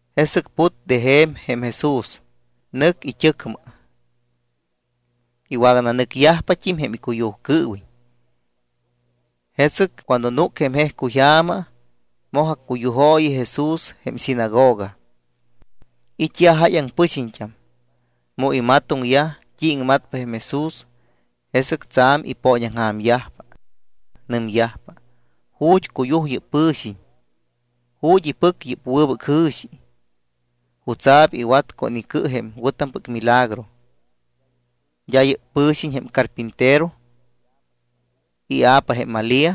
Jesɨc put de je̱m jém Jesús, nɨc it́ɨcmɨ. Iwagananɨcyajpat́im jém icuyujcɨɨwiñ. Jesɨc cuando núc jém jejcuyja̱ma, moj accuyujooyi Jesús jém sinagoga. It́yaj jáyaŋ pɨxiñt́am. Mu imatoŋyaj t́i iŋmatpa jém Jesús, jesɨc tsa̱m ipooñaŋja̱myajpa. Nɨmyajpa: —¿Ju̱t́ cuyuj yɨ́p pɨ̱xiñ? ¿Ju̱t́ ipɨc yɨ́p wɨbɨc jɨ̱xi? ¿Jutsa̱p iwat con icɨ jém wɨ̱tampɨc milagro? ¿D́a yɨ́p pɨ̱xiñ jém carpintero? Ia̱pa jém Malía.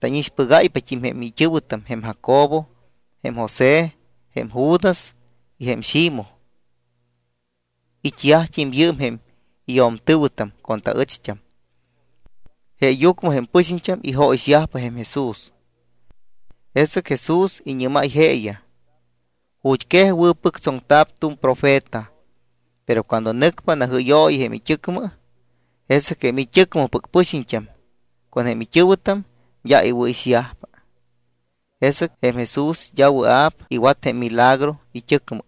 Tánixpɨgáypat́im jém it́ɨ̱wɨtam jém Jacobo, jém José, jém Judas y jém Ximoj. It́yajt́im yɨɨm jém iyo̱mtɨ̱wɨtam con taɨcht́am. Jeeyucmɨ jém pɨxiñt́am ijóyixyajpa jém Jesús. Jesɨc Jesús iñɨ́máy jeeyaj: —Ju̱t́quej wɨ̱pɨctsoŋta̱p tu̱m jém profeta, pero cuando nɨcpa najɨ́yooyi it́ɨcmɨ, jesɨc jém it́ɨcmɨpɨc pɨxiñt́am con jém it́ɨ̱wɨtam d́a iwɨ̱ixyajpa. Jesɨc jém Jesús d́a wɨa̱p iwat jém milagro it́ɨcmɨ.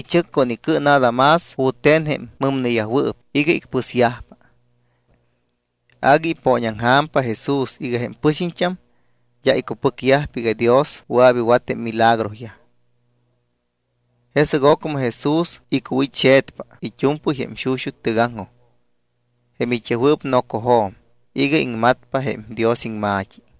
Ichɨc con icɨ nada más jute̱n jém mɨmneyajwɨɨp iga icpɨsyajpa. Agui ipooñaŋja̱mpa Jesús iga jém pɨxiñt́am d́a icupɨcyajpa iga Dios wɨa̱p iwat jém milagroyaj. Jesɨc ocmɨ Jesús icuwit́xe̱tpa it́u̱mpɨy jém xuxut́ tɨgaŋjoj jém it́yajwɨɨp nocojo̱m iga iŋmatpa jém Dios iŋma̱t́i.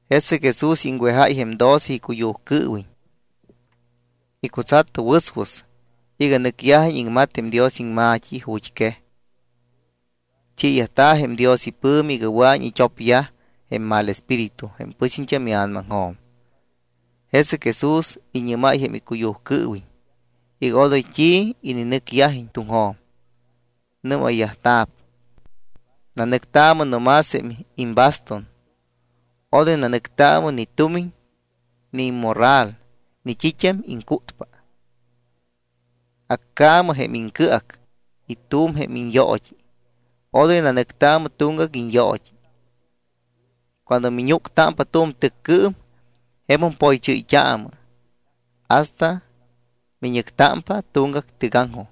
Jesɨc Jesús iŋwejáy jém doce icuyujcɨɨwiñ. Icutsat wɨswɨs iga nɨcyajiñ iŋmat jém Dios iŋma̱t́i ju̱t́quej. Chiiyajta̱ jém Dios ipɨ̱mi iga wɨa̱iñ it́opyaj jém mal espíritu jém pɨxiñt́am ia̱namaŋjo̱m. Jesɨc Jesús iñɨ́máy jém icuyujcɨɨwiñ iga odoy t́i ininɨcyajiñ tuŋjo̱m. Nɨ́mayyajta̱p: —Nanɨctaamɨ no más jém imbastun. Odoy nanɨctaamɨ ni tumiñ, ni immorral ni t́it́am iŋcútpa. Accaamɨ jém iŋcɨac y tu̱m jém iñyoot́i. Odoy nanɨctaamɨ tuŋgac iñyoot́i. Cuando miñúctámpa tu̱m tɨccɨɨm, jemum poychɨ́yt́aamɨ hasta miñɨctámpa tuŋgac tɨgaŋjoj.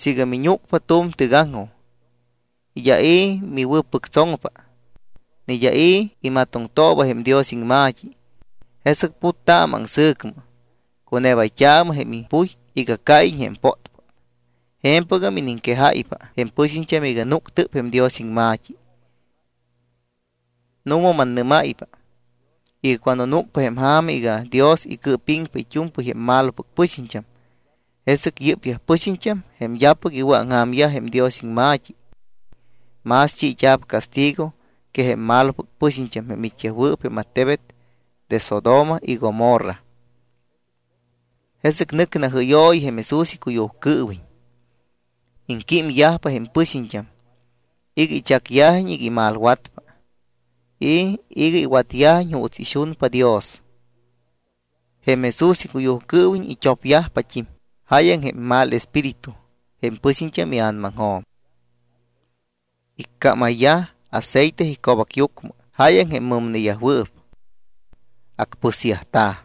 Siiga miñúcpa tu̱m tɨgaŋjoj, y d́a i̱ miwɨ̱pɨctsoŋpa, ni d́a i̱ imatoŋtooba jém Dios iŋma̱t́i, jesɨc puttaamɨ aŋsɨ̱cmɨ, cunebayt́aamɨ jém impuy iga cáyiñ jém pótpót. Je̱mpɨgam iniŋquejáypa jém pɨxiñt́am iga núctɨp jém Dios iŋma̱t́i. Nu̱ma mannɨ́máypa iga cuando núcpa jém ja̱ma iga Dios icɨɨpiŋpa it́u̱mpɨy jém malopɨc pɨxiñt́am, jesɨc yɨ́pyaj pɨxiñt́am jém d́apɨc iwɨ̱aŋja̱myaj jém Dios iŋma̱t́i, más chiit́a̱p castigo que jém malopɨc pɨxiñt́am jém it́yajwɨɨp jém attebet de Sodoma y Gomorra. Jesɨc nɨc najɨ́yooyiyaj jém Jesús icuyujcɨɨwiñ. Iŋquímyajpa jém pɨxiñt́am iga ichacyajiñ iga imalwatpa y iga iwatyajiñ juuts ixunpa Dios. Jém Jesús icuyujcɨɨwiñ it́opyajpat́im jáyaŋ jém mal espíritu jém pɨxiñt́am ia̱namaŋjo̱m. Iccámayyaj aceite ico̱bacyucmɨ jáyaŋ jém mɨmneyajwɨɨp. Acpɨsyajta̱.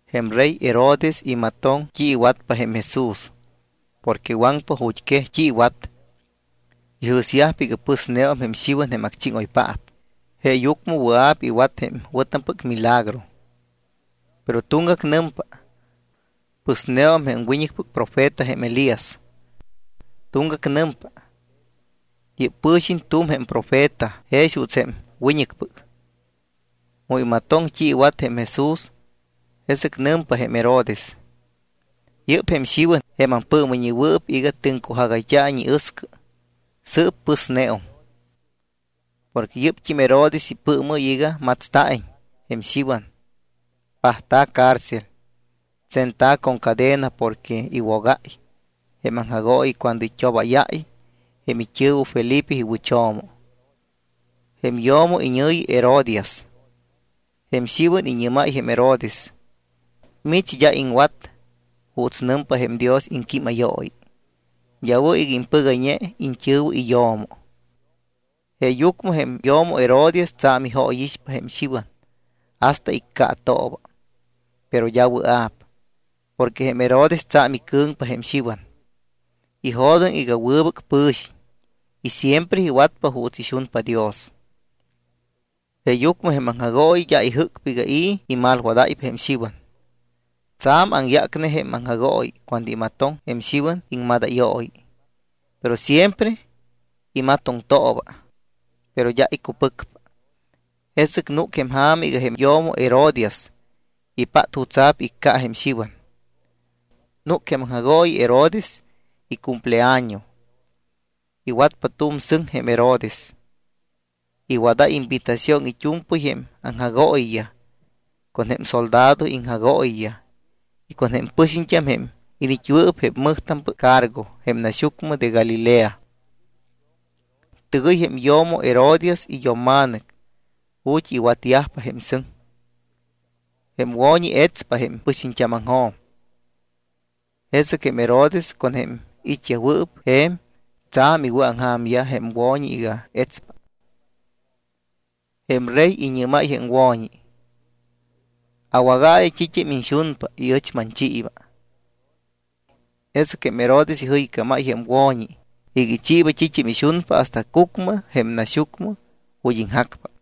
Jém rey Herodes imatoŋ t́i iwatpa jém Jesús porque waŋpa ju̱t́quej t́i iwat. Ijɨ̱syajpa iga pɨsneum jém Xiwan jém acchíŋoypaap, jeeyucmɨ wɨa̱p iwat jém wɨ̱tampɨc milagro. Pero tuŋgac nɨmpa: —Pɨsneum jém wiñɨcpɨc profeta jém Elías. Tuŋgagam nɨmpa: —Yɨ́p pɨ̱xiñ tu̱m jém profeta jex juuts jém wiñɨcpɨc. Mu imatoŋ t́i iwat jém Jesús, jesɨc nɨmpa jém Herodes: —Yɨ́p jém Xiwan jém ampɨɨmɨyñewɨɨp iga tɨŋcujagayt́a̱iñ iɨscɨ. Sɨɨp pɨsneum. Porque yɨ́pt́im Herodes ipɨɨmɨ́y iga matsta̱iñ jém Xiwan. Pajta̱ cárcel, tsenta̱ con cadena porque iwogáy jém aŋjagooyi cuando it́obáyáy jém it́ɨ̱wɨ Felipe iwɨcho̱mo. Jém yo̱mo iñɨ̱yi Herodías. Jém Xiwan iñɨ́máy jém Herodes: —Mich d́a iŋwat juuts nɨmpa jém Dios iŋquímayooyi. D́a wɨ̱ iga impɨgayñe iñt́ɨ̱wɨ iyo̱mo. Jeeyucmɨ jém yo̱mo Herodías tsa̱m ijóyixpa jém Xiwan hasta iccaatooba, pero d́a wɨa̱p. Porque jém Herodes tsa̱m icɨ̱ŋpa jém Xiwan. Ijo̱doŋ iga wɨbɨc pɨ̱xiñ y siempre iwatpa juuts ixunpa Dios. Jeeyucmɨ jém aŋjagooyi d́a ijɨ́cpa iga i̱ imalwadáypa jém Xiwan. Tsa̱m aŋyácpa jém aŋjagooyi cuando imatoŋ jém Xiwan iŋmadayooyi, pero siempre imatoŋtooba. Pero d́a icupɨcpa. Jesɨc núc jém ja̱ma iga jém yo̱mo Herodías ipát jutsa̱p icca jém Xiwan. Núc jém aŋjagooyi Herodes icumpleaño. Iwatpa tu̱m sɨŋ jém Herodes. Iwadáy invitación it́u̱mpɨy jém aŋjagooyiyaj con jém soldado iŋjagooyiyaj y con jém pɨxiñt́am jém iniit́yajwɨɨp jém mɨjtampɨc cargo jém naxyucmɨ de Galilea. Tɨgɨy jém yo̱mo Herodías iyo̱mma̱nɨc ju̱t́ iwatyajpa jém sɨŋ. Jém wo̱ñi etspa jém pɨxiñt́ámaŋjo̱m. Jesɨc jém Herodes con jém it́yajwɨɨp je̱m tsa̱m iwɨ̱aŋja̱myaj jém wo̱ñi iga etspa. Jém rey iñɨ́máy jém wo̱ñi: —Awágaayɨ t́it́am iñxunpa y ɨch manchiiba. Jesɨc jém Herodes ijɨycámáy jém wo̱ñi iga ichiiba t́it́am ixunpa hasta cucmɨ jém naxyucmɨ ju̱t́ iŋjacpa.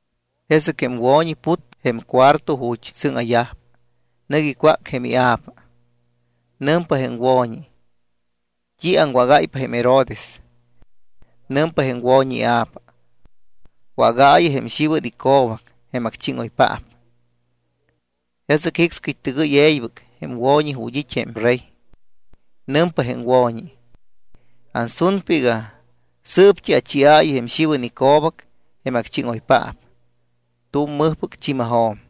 Jesɨc jém wo̱ñi put jém cuarto ju̱t́ sɨ́ŋa̱yajpa. Nɨc icwác jém ia̱pa. Nɨmpa jém wo̱ñi: —¿T́i aŋwágáypa jém Herodes? Nɨmpa jém wo̱ñi ia̱pa: —Wágaayɨ jém Xiwan ico̱bac jém acchíŋoypaap. Jesɨc jicscɨy tɨgɨy e̱ybɨc jém wo̱ñi ju̱t́ it́ jém rey. Nɨmpa jém wo̱ñi: —Ansunpa iga sɨɨpt́i achiaayɨ jém Xiwan ico̱bac jém acchíŋoypaap tu̱m mɨjpɨc chi̱majo̱m.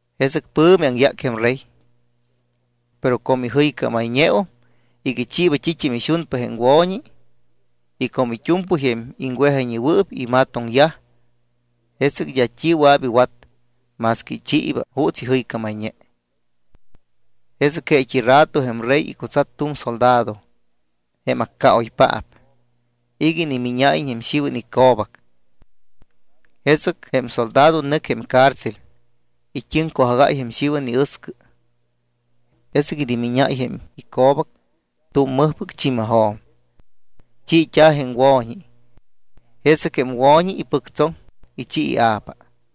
Jesɨc pɨ̱mi aŋyác jém rey, pero como ijɨycámayñeum iga ichiiba t́it́am ixunpa jém wo̱ñi y como it́u̱mpɨy jém iŋwejayñewɨɨp imatoŋyaj, jesɨc d́a t́i wɨa̱p iwat más que ichiiba juuts ijɨycámayñe. Jesɨc jeet́i rato jém rey icutsat tu̱m soldado, jém accaoypaap, iga inimíñáyiñ jém Xiwan ico̱bac. Jesɨc jém soldado nɨc jém cárcel, it́ɨŋcujagáy jém Xiwan iɨscɨ. Jesɨc inimíñáy jém ico̱bac tu̱m mɨjpɨc chi̱majo̱m. Chiit́a̱ jém wo̱ñi. Jesɨc jém wo̱ñi ipɨctsoŋ, ichi ia̱pa.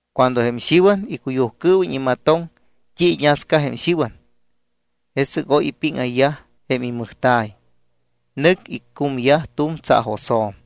Cuando jém Xiwan icuyujcɨɨwiñ imatoŋ t́i iñasca jém Xiwan, jesɨc oy ipíŋayyaj jém imɨjta̱y, nɨc icúmayyaj tu̱m tsaajosjo̱m.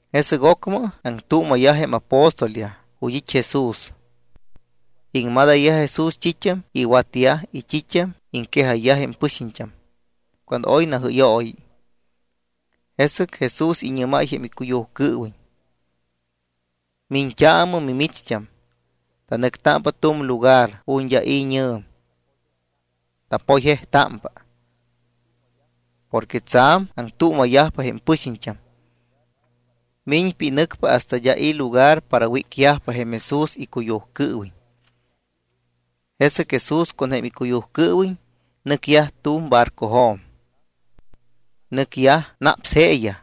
Jesɨc ocmɨ aŋtuuma̱yaj jém apóstolyaj ju̱t́ it́ Jesús. Iŋmadayyaj Jesús t́it́am iwatyaj y t́it́am iŋquejayyaj jém pɨxiñt́am cuando oy najɨ́yooyi. Jesɨc Jesús iñɨ́máy jém icuyujcɨɨwiñ: —Miñt́aamɨ mimicht́am, tanɨctámpa tu̱m lugar ju̱t́ d́a i̱ñɨ̱m. Tapoyjejtámpa. Porque tsa̱m aŋtuuma̱yajpa jém pɨxiñt́am, miñpa y nɨcpa hasta d́a i̱ lugar para wícyajpa jém Jesús icuyujcɨɨwiñ. Jesɨc Jesús con jém icuyujcɨɨwiñ nɨcyaj tu̱m barcojo̱m. Nɨcyaj naps jeeyaj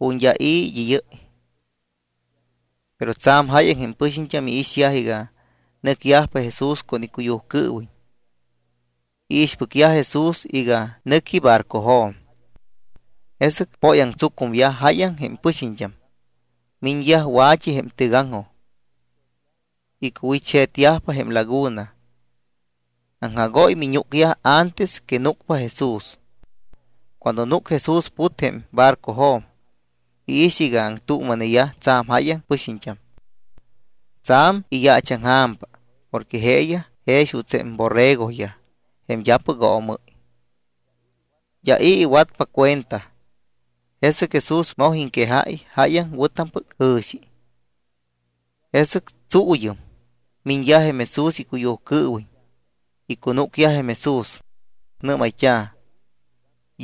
ju̱t́ d́a i̱ id́ɨ́yɨ́y. Pero tsa̱m jáyaŋ jém pɨxiñt́am iixyaj iga nɨcyajpa Jesús con icuyujcɨɨwiñ. Iixpɨcyaj Jesús iga nɨqui barcojo̱m. Jesɨc póyaŋtsucumyaj jáyaŋ jém pɨxiñt́am, miñyaj wa̱t́i jém tɨgaŋjoj. Icuwit́xe̱tyajpa jém laguna. Aŋjagóy miñúcyaj antes que núcpa Jesús. Cuando núc Jesús, put jém barcojo̱m, iix iga aŋtuuma̱neyaj tsa̱m jáyaŋ pɨxiñt́am. Tsa̱m iyaachaŋja̱mpa porque jeeyaj jex juuts jém borregoyaj jém d́apɨc oomɨ́y. D́a i̱ iwatpa cuenta. Jesɨc Jesús moj iŋquejáy jáyaŋ wɨ̱tampɨc jɨ̱xi. Jesɨc tsuuyɨm, miñyaj jém Jesús icuyujcɨɨwiñ, icunúcyaj jém Jesús. Nɨ́mayt́a̱: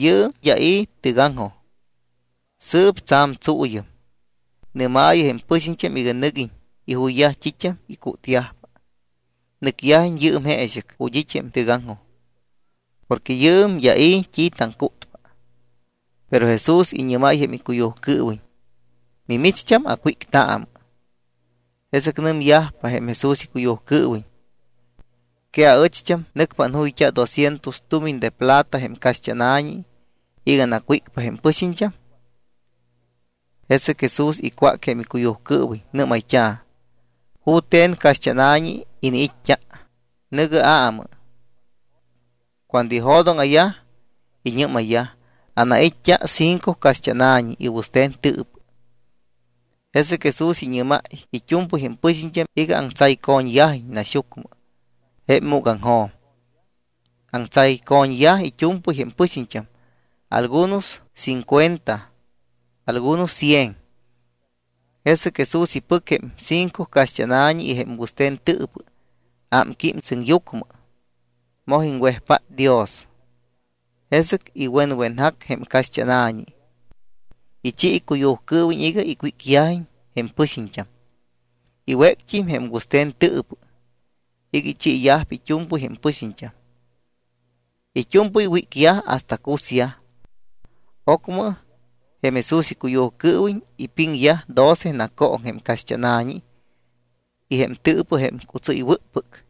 —Yɨɨm d́a i̱ tɨgaŋjoj, sɨɨp tsa̱m tsuuyɨm. Nɨ́maayɨ jém pɨxiñt́am iga nɨguiñ ijuyyaj t́it́am icútyajpa. Nɨcyajiñ yɨɨm jeexɨc ju̱t́ it́ jém tɨgaŋjoj porque yɨɨm d́a i̱ t́i taŋcútpa. Pero Jesús iñɨ́máy jém icuyujcɨɨwiñ: —Mimicht́am acwíctaamɨ. Jesɨc nɨmyajpa jém Jesús icuyujcɨɨwiñ: —¿Que aɨcht́am nɨcpa anjúyayt́a doscientos tumiñ de plata jém caxt́ána̱ñi iga anacwícpa jém pɨxiñt́am? Jesɨc Jesús icwác jém icuyujcɨɨwiñ. Nɨ́mayt́a̱: —¿Jute̱n caxt́ána̱ñi iniit́t́a? Nɨ̱gɨ aamɨ. Cuando ijo̱dóŋa̱yaj, iñɨ́mayyaj: —Anait́t́a cinco caxt́ána̱ñi y wɨste̱n tɨɨpɨ. Jesɨc Jesús iñɨ́máy it́u̱mpɨy jém pɨxiñt́am iga aŋtsayco̱ñyajiñ naxyucmɨ jém múgaŋjo̱m. Aŋtsayco̱ñyaj it́u̱mpɨy jém pɨxiñt́am algunos cincuenta algunos cien. Jesɨc Jesús ipɨc jém cinco caxt́ána̱ñi y jém wɨste̱n tɨɨpɨ. Ámquím sɨŋyucmɨ, moj iŋwejpát Dios. Jesɨc iwenwenjac jém caxt́ána̱ñi. Ichi icuyujcɨɨwiñ iga icwícyajiñ jém pɨxiñt́am. Iwéct́im jém wɨste̱n tɨɨpɨ iga ichiiyajpa it́u̱mpɨy jém pɨxiñt́am. It́u̱mpɨy wícyaj hasta cusyaj. Ocmɨ jém Jesús icuyujcɨɨwiñ ipiŋyaj doce nacooŋ jém caxt́ána̱ñi y jém tɨɨpɨ jém cutsɨ́ywɨ́ppɨc.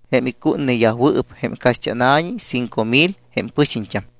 Jém icútneyajwɨɨp jém caxt́ána̱ñi cinco mil jém pɨxiñt́am.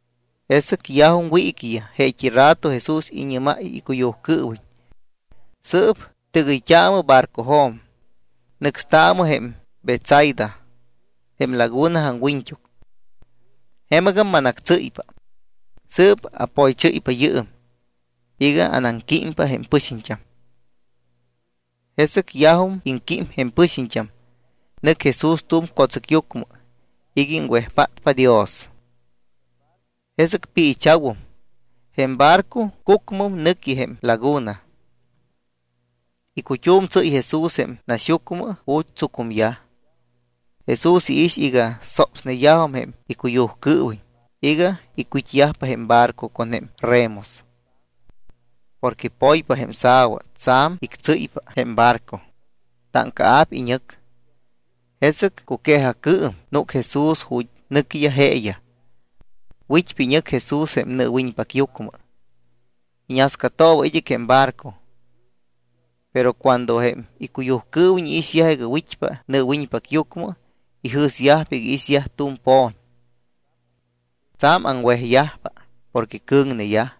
Jesɨc yajum wiiquiyaj, jeet́i rato Jesús iñɨ́máy icuyujcɨɨwiñ: —Sɨɨp tɨgɨyt́aamɨ barcojo̱m, nɨcstaamɨ jém Betsaida jém laguna aŋwiñt́uc. Jemɨgam manactsɨ́ypa. Sɨɨp apoychɨ́ypa yɨɨm iga anaŋquímpa jém pɨxiñt́am. Jesɨc yajum iŋquímyaj jém pɨxiñt́am, nɨc Jesús tu̱m co̱tsɨcyucmɨ iga iŋwejpátpa Dios. Jesɨc piicha̱wum, jém barco cucmɨm nɨqui jém laguna. Icut́um tsɨ́y Jesús jém naxyucmɨ ju̱t́ tsucumyaj. Jesús iix iga sopsneyajum jém icuyujcɨɨwiñ iga icwit́yajpa jém barco con jém remos. Porque poypa jém sa̱wa, tsa̱m ictsɨ́ypa jém barco, táŋcaa̱p iñɨc. Jesɨc cuque̱jacɨɨm núc Jesús ju̱t́ nɨquiyaj jeeyaj. Wit́pa iñɨc Jesús jém nɨɨwiñpacyucmɨ, iñascatooba id́ɨc jém barco. Pero cuando jém icuyujcɨɨwiñ iixyajpa iga wit́pa nɨɨwiñpacyucmɨ, ijɨ̱syajpa iga iixyaj tu̱m po̱ñ. Tsa̱m aŋwejyajpa porque cɨ̱ŋneyaj.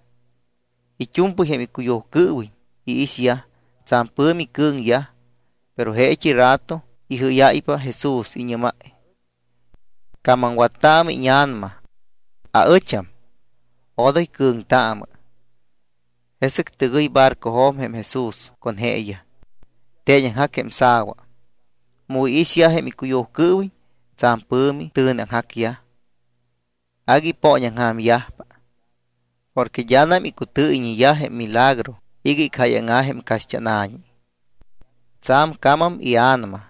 It́u̱mpɨy jém icuyujcɨɨwiñ iixyaj. Tsa̱m pɨ̱mi cɨ̱ŋyaj. Pero jeet́i rato ijɨ́yáypa Jesús, iñɨ́máy: —¡Camamwattaamɨ íña̱nama! ¡Aɨcham! ¡Odoy cɨ̱ŋtaamɨ! Jesɨc tɨgɨy barcojo̱m jém Jesús con jeeyaj. Teeñaŋjac jém sa̱wa. Mu iixyaj jém icuyujcɨɨwiñ, tsa̱m pɨ̱mi tɨ̱neaŋjacyaj, agui ipooñaŋja̱myajpa. Porque d́anam icutɨɨyɨyñeyaj jém milagro iga icjáyaŋa̱ jém caxt́ána̱ñi. Tsa̱m camam ia̱nama,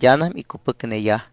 d́anam icupɨcneyaj.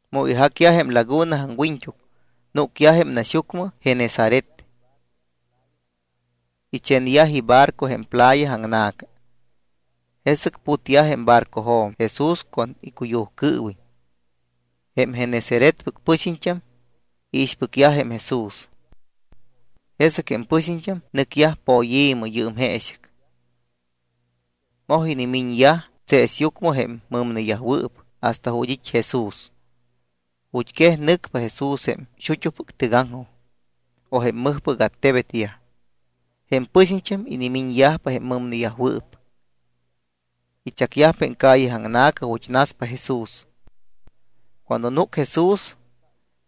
Mu ijacyaj jém laguna aŋwiñt́uc, núcyaj jém naxyucmɨ Genesaret. Ichenyaj ibarco jém playa aŋna̱ca. Jesɨc putyaj jém barcojo̱m Jesús con icuyujcɨɨwiñ, jém Genesaretpɨc pɨxiñt́am iixpɨcyajpa jém Jesús. Jesɨc jém pɨxiñt́am nɨcyaj poyi̱mɨ yɨɨm jeexɨc. Moj inimiñyaj tseesyucmɨ jém mɨmneyajwɨɨp hasta ju̱t́ it́ Jesús. Ju̱t́quej nɨcpa Jesús jém xut́upɨc tɨgaŋjoj o jém mɨjpɨc attebetyaj, jém pɨxiñt́am inimiñyajpa jém mɨmneyajwɨɨp. Ichacyajpa jém calle aŋna̱ca ju̱t́ naspa Jesús. Cuando núc Jesús,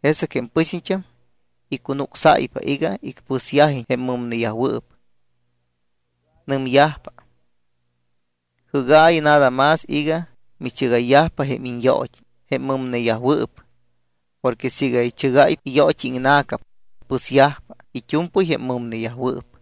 jesɨc jém pɨxiñt́am icunucsáypa iga icpɨsyajiñ jém mɨmneyajwɨɨp. Nɨmyajpa: —Jɨ́gaayɨ nada más iga michɨgayyajpa jém iñyoot́i jém mɨmneyajwɨɨp. Porque siiga ichɨgáypa iyoot́i iŋna̱ca, pɨsyajpa it́u̱mpɨy jém mɨmneyajwɨɨp.